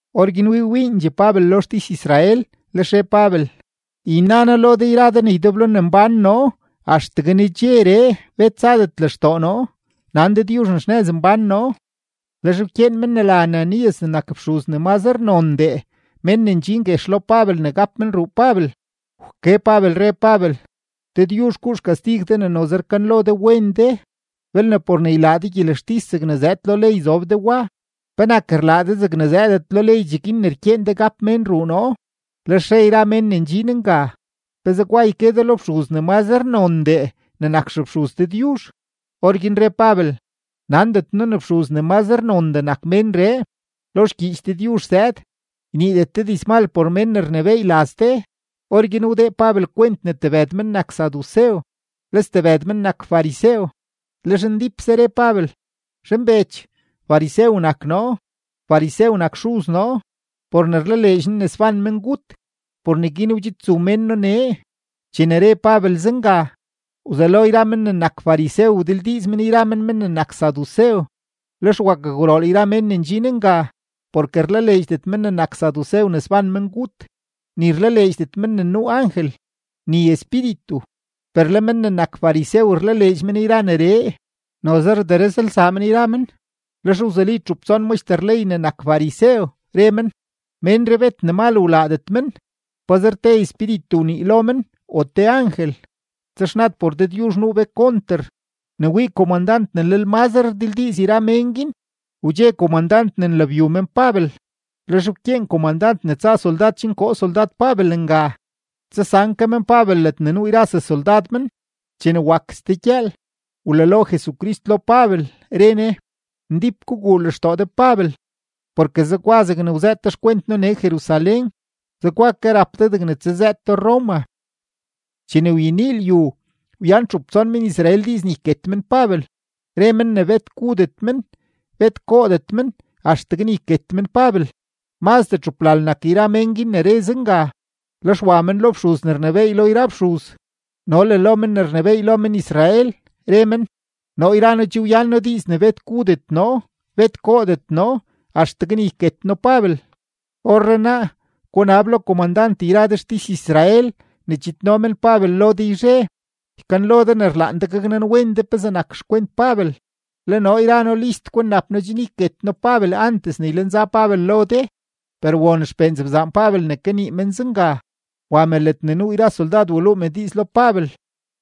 Orguin wii wiindxee Pabel lo xtis-Israel, lex re Pabel: ―Yna noo lo de yra de ne ydeblo ne mbán noo axtegue nedxeree bet zadet lextoo noo, nan Dëdyuzh ne xnëz mbán noo. Lex wkyeen men ne la Ananías ne nak fxuz ne mazre nondee mén ne ndxin guex lo Pabel ne gap men ruu Pabel. Wke Pabel, re Pabel: ―¡Dëdyuzh guu xkastig de ne noze rkanlo de wen de! Belne por ne ylaa de gyelextis zegne zëëd lo ley zob de wa, ¿penak rlaa de zegne zëëdet lo ley cheguin ne rkyeen de gap mén ruu noo? Lex re yra mén ne ndxin nga: ―¿Pe zegwa yke de lo fxuz ne mazre nondee ne nak xefxuz Dëdyuzh? Orguin re Pabel: ―Nandet noo ne fxuz ne mazre nondee nak ménree. Lo xgyiich Dëdyuzh zëëd: “Yniidet de dizmal por mén ne rnebééy laz de.” Orguin wdee Pabel kwent ne tebëd men nak sadusew, le stebëd men nak farisew, lex ndípse re Pabel: ―Zhanbech, farisew nak noo, farisew nak xuz noo. Por ne rlaleedx noo ne sban mengut, por neguin wdxidzu mén noo nee. Chene re Pabel zenga, wzelo yra men ne nak farisew wdildiiz men yra men men ne nak sadusew, lex wakgwrool yra men ne ndxin nga. Porke rlaleedxdet men ne nak sadusew ne sban mengut, ni rlaleedxdet men ne nuu angel, ni espíritu, per le men ne nak farisew rlaleedx men yra neree. Noze rderëzlsaa men yra men. Lex wzuli txup tson maxter ley ne nak farisew, re men: ―Ménree bet ne mal wlaadet men. Pazer te espíritu wnii lo men o te angel, texnad por Dëdyuzh nuu be konter. Ne wii komandant ne lel mazre rdildiiz yra mén guin, wdxe komandant ne nlabyu men Pabel. Lex wkyeen komandant ne tsa soldad chen koo soldad Pabel nga, tsasan ke men Pabel ledne nuu yra sesoldad men. Chene wak ste gyëël, wlalo Jesucrist lo Pabel, re Ne: ―Ndíp guguu lextoo de Pabel, porke zegwa zegne wzëët de xkwent noo nee Jerusalén, zegwa ke rap de degne tsazëëto Roma. Chene wyenii lyu, wyan txup tson men-Israel diiz ne yket men Pabel; re men ne bet gudet men, bet goodet men axtegue ne yket men Pabel. Mazdee txuplal nak yra mén guin ne re zenga. Lex wa men lo fxuz ne rnebééy lo yra fxuz no le lo men ne rnebééy lo men-Israel, re men: ―Noo yra noo che wyan noo diiz ne bet gudet noo, bet goodet noo axtegue ne yket noo Pabel. Orrenaa, gunab lo komandant yra de xtis-Israel ne chidno men Pabel lo de yzhe, ykanlo de ne rlaan de gaknanwen de pezee nak xkwent Pabel. Le noo yra noo list kwinnap noo chen yket noo Pabel antes ne ylenza Pabel lo de. Per won xpee nzebzaan Pabel ne kanii men zenga, wa me ledne nuu yra soldad, waluu me diiz lo Pabel.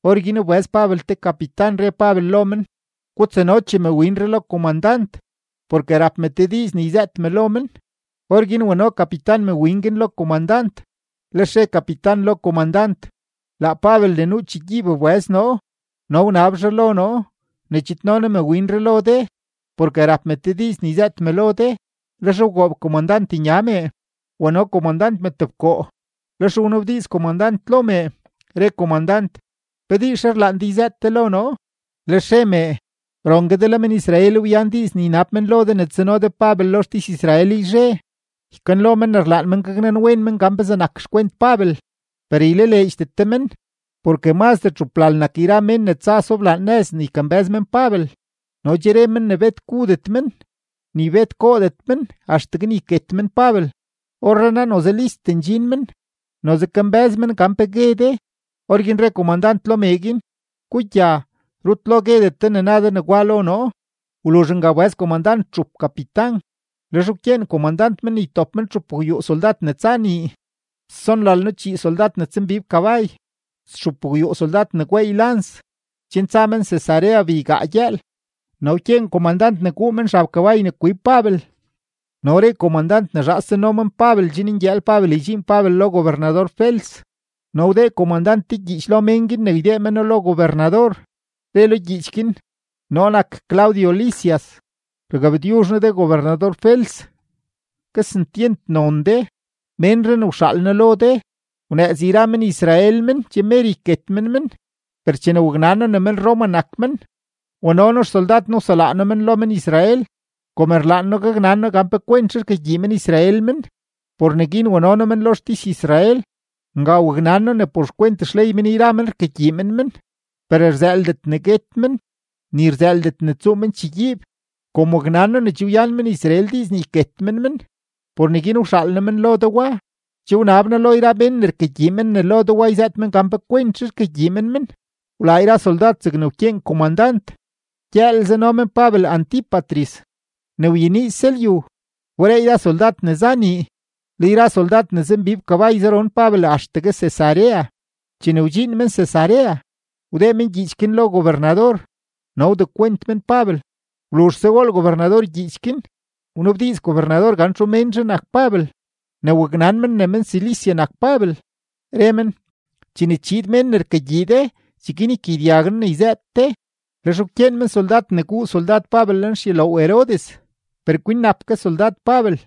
Orguin wbëz Pabel te kapitan, re Pabel lo men: ―Gutsanochee mewinree lo komandant, porke rap me te diiz ne yzëët me lo men. Orguin wano kapitan mewin guin lo komandant, lex re kapitan lo komandant: ―Laa Pabel ne nuu chegyiib wbëz noo no wnab zhaa lo noo ne chidno noo mewinree lo de, porke rap me te diiz ne yzëët me lo de. Lex wgoob komandant nya me, wano komandant me tebkoo, lex wnabdiiz komandant lo mee, re komandant: ―¿Pe diizzhe rlaan de yzëët de lo noo? Lex re mee: ―Rongue de le men-Israel wyan diiz ne ynab men lo de ne tsano de Pabel lo xtis-Israel yzhe, ykanlo men ne rlaan men gaknanwen men pezee nak xkwent Pabel. Per ylaleedxdet de men, porke mazdee txuplal nak yra mén ne tsa soblaan nëz ne ykambë́z men Pabel, no che re men ne bet gudet men, ni bet goodet men axtegue ne yket men Pabel. Orrenaa noze list ndxin men, noze kambë́z men gan pe gue de. Orguin re komandant lo mee guin: ―Gugya, rut lo guedet de ne na de negwa lo noo. Wluzh nga wbëz komandant txup kapitan, lex wkyeen komandant men ne ytop men txupgwyuu soldad ne tsa nii, stsonlalno-chii soldad ne tsambib kabay, stxupgwyuu soldad ne gweey lans, chen tsa men Cesarea beygaa gyëël. No wkyeen komandant ne guu men xab kabay ne kwib Pabel, no re komandant ne zhaas tsano men Pabel chen ngyëël Pabel ydxiin Pabel lo gobernador-Fels. No wdee komandant te gyiich lo mén guin ne ydee meno lo gobernador, re lo gyiich guin: “Noo nak Claudio Lisias, rgabtyuzh noo de gobernador-Fels, kesentyent non de. Ménree ne wxaal noo lo de, wnëëz yra men-Israel men, che mer yket men men, per chene waknan noo ne men-Roma nak men, wano noo xsoldad noo, waselaa noo men lo men-Israel. Kom rlaan noo gaknan noo gan pe kwentzhe rkagyii men-Israel men, por neguin wano noo men lo xtis-Israel. Nga waknan noo ne por xkwent xley men yra men rkagyii men men, per rzëëldet ne guet men, ni rzëëldet ne tsuu men chegyiib. Kom waknan noo ne che wyan men-Israel diiz ne yket men men, por neguin wxaal noo men lo de wa. Che wnab noo lo yra mén ne rkagyii men ne lo de yzëët men gan pe kwentzhe rkagyii men men.” Wlaa yra soldad zegne wkyeen komandant, gyëël zano men Pabel Antípatris. Ne wyeniise lyu, wberee yra soldad ne za nii, le yra soldad ne zambib kabay zaron Pabel axtegue Cesarea. Chene wdxiin men Cesarea, wdee men gyiich guin lo gobernador no wdekwent men Pabel. Wluzhse wool gobernador gyiich guin, wnabdiiz gobernador gan txu ménzhe nak Pabel. Ne waknan men ne men-Cilicia nak Pabel, re men: ―Chene chiid mén ne rkagyii de, cheguin ykagyedyag noo ne yzëët de. Lex wkyeen men soldad ne guu soldad Pabel lenxyuloow Herodes, per kwinnap ke soldad Pabel.